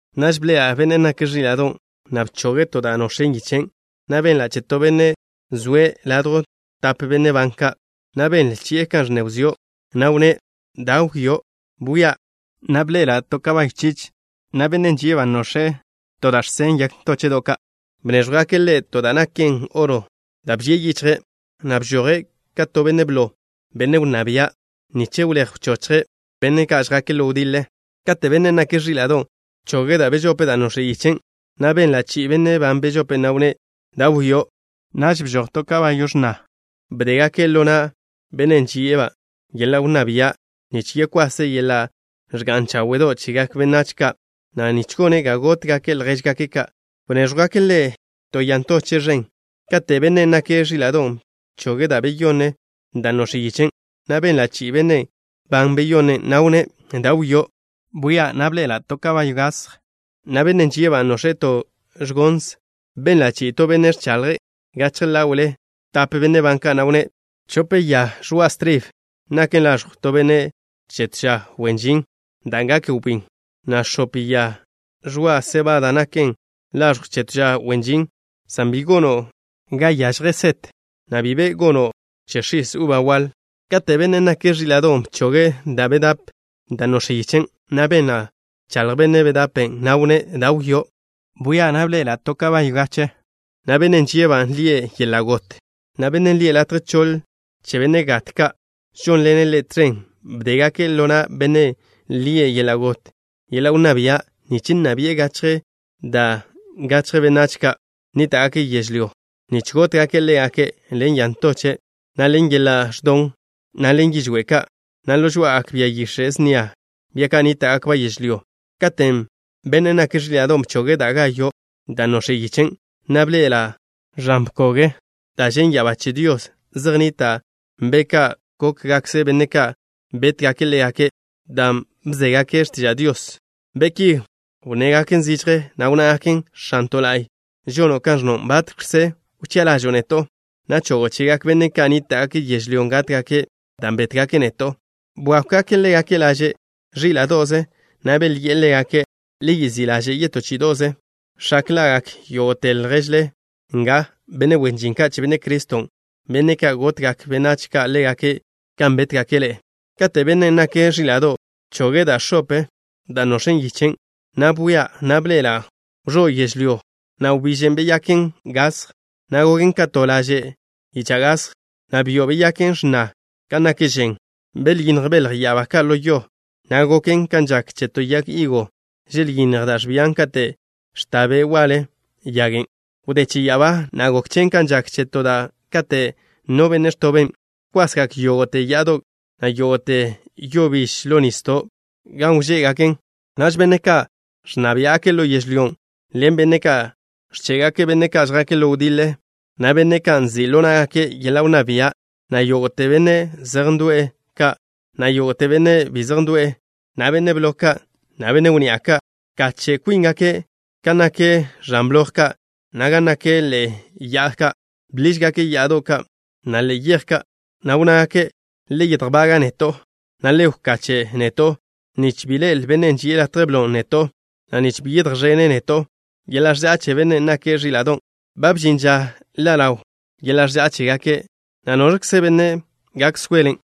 Naž bḻe'ela' Bennen' nake' Ẕíla'do', na' bchoge' to da' nox̱en yichen', na' benla' che to benne' zoe' ladjw tap benne' ban ka', na' benle chi'e kan ẕnne wzió', na' wnné': “Da wio'.” Bwia', na' bḻe'ela' to bia chich, na' bennen' žie'-ba' nox̱e' to da' žsen yag ntóche'do' ka'. Bnéẕjwgake' ḻe' to da' naken oro da' bžie' yichje', na' bžoje' ka to benne' blo, benne' wnná bia', nich wléj wchochje' benne' ka' žjake' ḻo wdiḻe. Kate' Bennen' nake' Ẕíla'do' bchoge' da' bežope da' nox̱en yichen', na' benla' che benne' ban bežope', na' wnné': “Da wio'.” Naž bžoj to bia x̱na. Bdégake' ḻo na' bennen' žie'-ba' yeḻa' wnná bia' nich yekwase' yeḻa' ẕga'n cháwe'do' chegak benách ka', na' nich gone' ga gótgake' ljéžgake' ka'. Bnéẕjwgake' ḻe' to ya ntoche' ẕen. Kate' Bennen' nake' Ẕíla'do' bchoge' da' beyonne da' nox̱en yichen', na' benla' che benne' ban beyonne', na' wnné': “Da wio'.” Bwia', na' bḻe'ela' to bia gasj, na' bennen' žie'-ba' nox̱e' to ẕgons. Benla' chi'i to benne' ẕchaḻje' gachje ḻáwe'le tape benne' ban ka', na' wnné': “Chope ya ẕoa' stribe naken laẕjw to benne' che to ža wen žin dan' gak wbín, na' x̱ope ya ẕoa' sebada naken laẕjwe' che to ža wen žin, san bi gono' ga yažje set, na' bi be gono' che x̱is uba waḻ.” Kate' Bennen' nake' Ẕíla'do' bchoge' da' bedape da' nox̱en yichen', na' benla' bchaḻj bennen' ban bedape', na' wnné': “Da wio'.” Bwia', na' bḻe'ela' to bia gache, na' bennen' žie'-ba' lie' Yeḻa' Got, na' bennen' lie' Latje Choḻ Che Benne' Gat Ka' žónḻene' ḻe' tẕen. Bdégake' ḻo na' bennen' lie' Yeḻa' Got yeḻa' wnná bia' nich nna bi'e gachje da' gachje benách ka' nníta'gake' yežlyó, nich gótgake' ḻégake' ḻen ya ntoche', na' ḻen yeḻa' ẕdon, na' ḻen yižwé' ka', na' ḻo žoá'agak bia yix̱e' snia, bia ka' nníta'gakba' yežlyó. Kate' Bennen' nake' Ẕíla'do' bchoge' da' gayo' da' nox̱en yichen', na' bḻe'ela' ẕan bkog da' žen' ya'abá che Dios zej nnita' be' ka' gókgakkze benne' ka' bétgake' ḻégake' dan' bzégake' x̱tiža' Dios. Be' ki wnnegak zižje, na' wnnágaken: “X̱anto' la'y, žono' kan ẕnno'. ¿Batx̱kze wchi'a ḻažo'o neto', na' chogo' chegak benne' ka' nníta'gake' yežlyó gátgake' dan' bétgake' neto'?” Bwákwgake' ḻégake' laže' ẕíla'do'ze, na' belyi'e ḻégake': “Le yezí' ḻaže' yetó chí'ido'ze, x̱ak ḻa'gak yógo'te lježle nga, benne' wen žin ka' che Benne' Criston', benne' ka' gotgak benách ka' ḻégake' kan bétgake' ḻe'e.” Kate' Bennen' nake' Ẕíla'do' bchoge' da' x̱op da' nox̱en yichen', na' bwia', na' bḻe'ela' wẕó' yežlyó. Na' wbíž beyaken gasj, na' goken ka to laže' yicha' gasj, na' byo' beyaken x̱na kan nak žen. Belyínnj belj ya'abá ka' ḻo yo, na' goken kan žak che to yag higo, želyínnj da' ẕbian kate' ẕta be' waḻe yagen'. Wdé che ya'abá, na' gok chen kan žak che to da'a kate' no benne' ẕtoben'. Bkwasgak yógo'te ya'ado', na' yógo'te yo biž ḻo nisdo' ka' gan wžé'gaken. Naž benne' ka' ẕnna biá'gake' ḻo yežlyó ḻen benne' ka' ẕché'gake' benne' ka' žjake' ḻo wdiḻe, na' benne' ka' nzi' ḻo ná'gake' yeḻa' wnná bia', na' yógo'te benne' zej ndo'w ka', na' yógo'te benne' bi zej ndo'e, na' benne' blo ka', na' benne' wnni'a ka', bkache' kwíngake' gan nak ẕan bloj ka', na' gan nak ḻe'e ya'ado' ka'. Bḻížgake' ya'ado' ka', na' ḻe'e yej ka', na' wnnágake': “Le yedjbaga' neto', na' le wkache' neto', nich bi ḻe'el Bennen' ži'e latje blon' neto', na' nich bi yedjẕén neto' yeḻa' ẕža'a che Bennen' nake' Ẕíla'do'. Ba bžin ža ḻa' ḻaw yeḻa' ẕža'a chégake', na' ¿noẕkze benne' gak soelen'?”